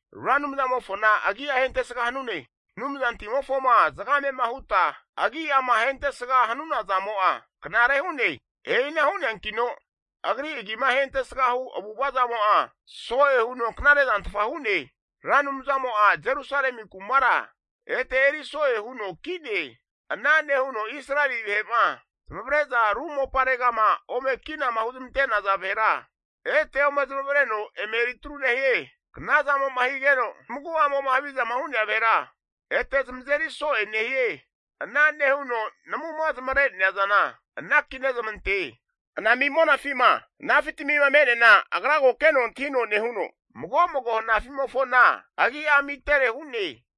Ra Anumzamofona agi'a ahentesga hanune. Anumzantimofoma zagamema huta agi'ama ahentesga hanuna zamo'a knare hu'ne. E'ina hu'neankino agri agima ahentesga hu avu'ava zamo'a so'e huno knare zantfa hu'ne. Ra Anumzamo'a Jerusalemi kumara ete eri so'e huno ki'ne. Ana nehuno Israeli vahe'ma zamavare'za ru moparegama ome kinama huzmante'naza vahera ete ome zamavareno eme eritru nehie. Knazamo'ma higeno zamagu'amo'ma havizama hu'nea vahera ete zamazeri so'e nehie. Ana nehuno namuma zamare'nea zana anaki nezamante. Anami monafima hanafi tamima me'neana agra ko keno antahino nehuno, mago mago hanafi'mofona agi'a amitere hu'ne.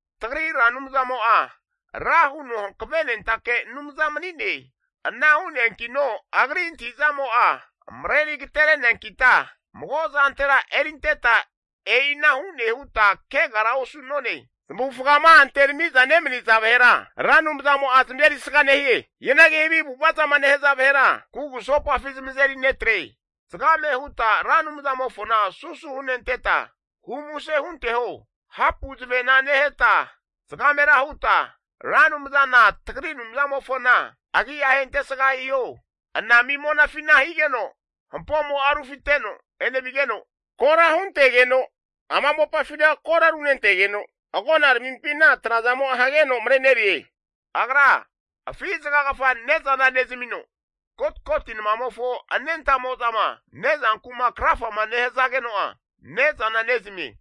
Tagri Ra Anumzamo'a ra huno hankavenentake Anumza mani'ne. Ana hu'neankino Agri antahi'zamo'a mareri agatereneankita, mago'zantera erinteta, e'ina hune huta kegara osu'none. Zamavufgama anterami'za nemaniza vahera Ra Anumzamo'a zamazerisga nehie. Hianagi havi avu'ava zama nehaza vahera kugusopafi zamazeri netre. Zgame huta Ra Anumzamofona susu henenteta humuse hunteho. Hapu zavena neheta zagamera huta, Ra Anumzana tagri Anumzamofona agi'a ahentesga hiho. Anami monafina higeno hampomo'a rufiteno enevigeno, kora huntegeno ama mopafina kora runentegeno, agonaramimpina trazamo'a hageno marenerie. Agra afi zagagafa ne'zana nezamino, kotkoti namamofo anentamo'zama ne'zanku'ma krafama nehazageno'a ne'zana nezamie.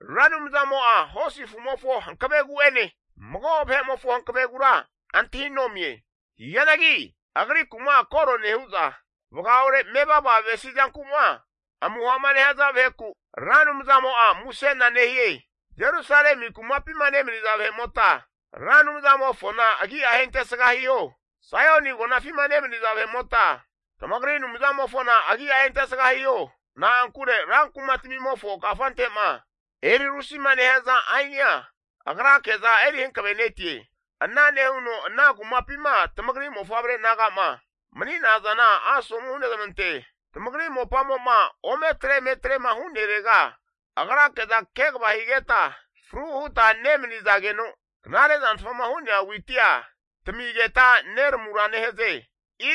Ra Anumzamo'a hosi afu'mofo hankavegu'ene, mago vahe'mofo hanavegura antahinomie. Hianagi Agriku'ma koro nehu'za, vagaore mevava avesi zanku'ma amuha'ma nehaza vaheku, Ra Anumzamo'a musena nehie. Jerusalemi kumapima nemaniza vahe'mota Ra Anumzamofona agi'a ahentesga hiho. Saioni agonafima nemaniza vahe'mota, tamagri Anumzamofona agi'a ahentesga hiho. Na'ankure rankumatamimofo kafante'ma eri rusima nehaza ainia agrake'za eri hankavenetie. Ana nehuno ana kumapima tamagri mofavre naga'ma mani'nazana asomu hunezmante. Tamagri mopamo'ma ometre eme atrema hu'nerega agrake'za kegava higeta fru huta nemanizageno, knare zantfama hu'nea witia tamigeta neramura nehaze.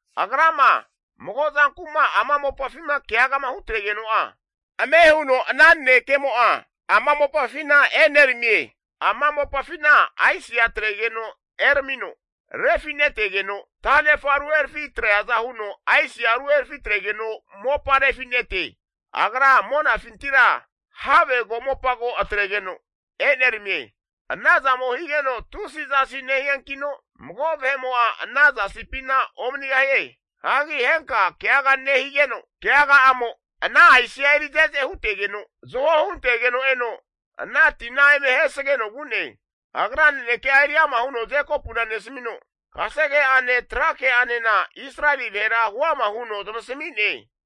Agrama mago zanku'ma ama mopafima keagama hutregeno'a, ame huno ana nanekemo'a ama mopafina eneramie. Ama mopafina aisia atregeno eramino refinetegeno, tanefa ruherafi atreaza huno aisia ruherafi atregeno mopa refi'nete. Agra monafintira have komopa ko atregeno eneramie. Anazamo higeno tusi zasi nehiankino, mago vahe'mo'a ana zasipina omanigahie. Hagi henka keaga nehigeno, keaga'amo ana aisia eri ze'ze hutegeno, zaho huntegeno eno ana tina eme ahesageno vu'ne. Agra naneke'a eri ama huno Jekopuna nesamino, kasege'ane tra ke'anena Israeli vahera huama huno zamasami'ne.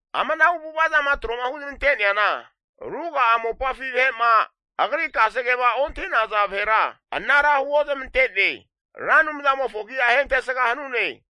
Amanahu avu'ava zama tro'ma huzmante'neana, ruga'a mopafi vahe'ma agri kasegema ontahi'naza vahera anara huozmante'ne. Ra Anumzamofona agi'a ahentesga hanune.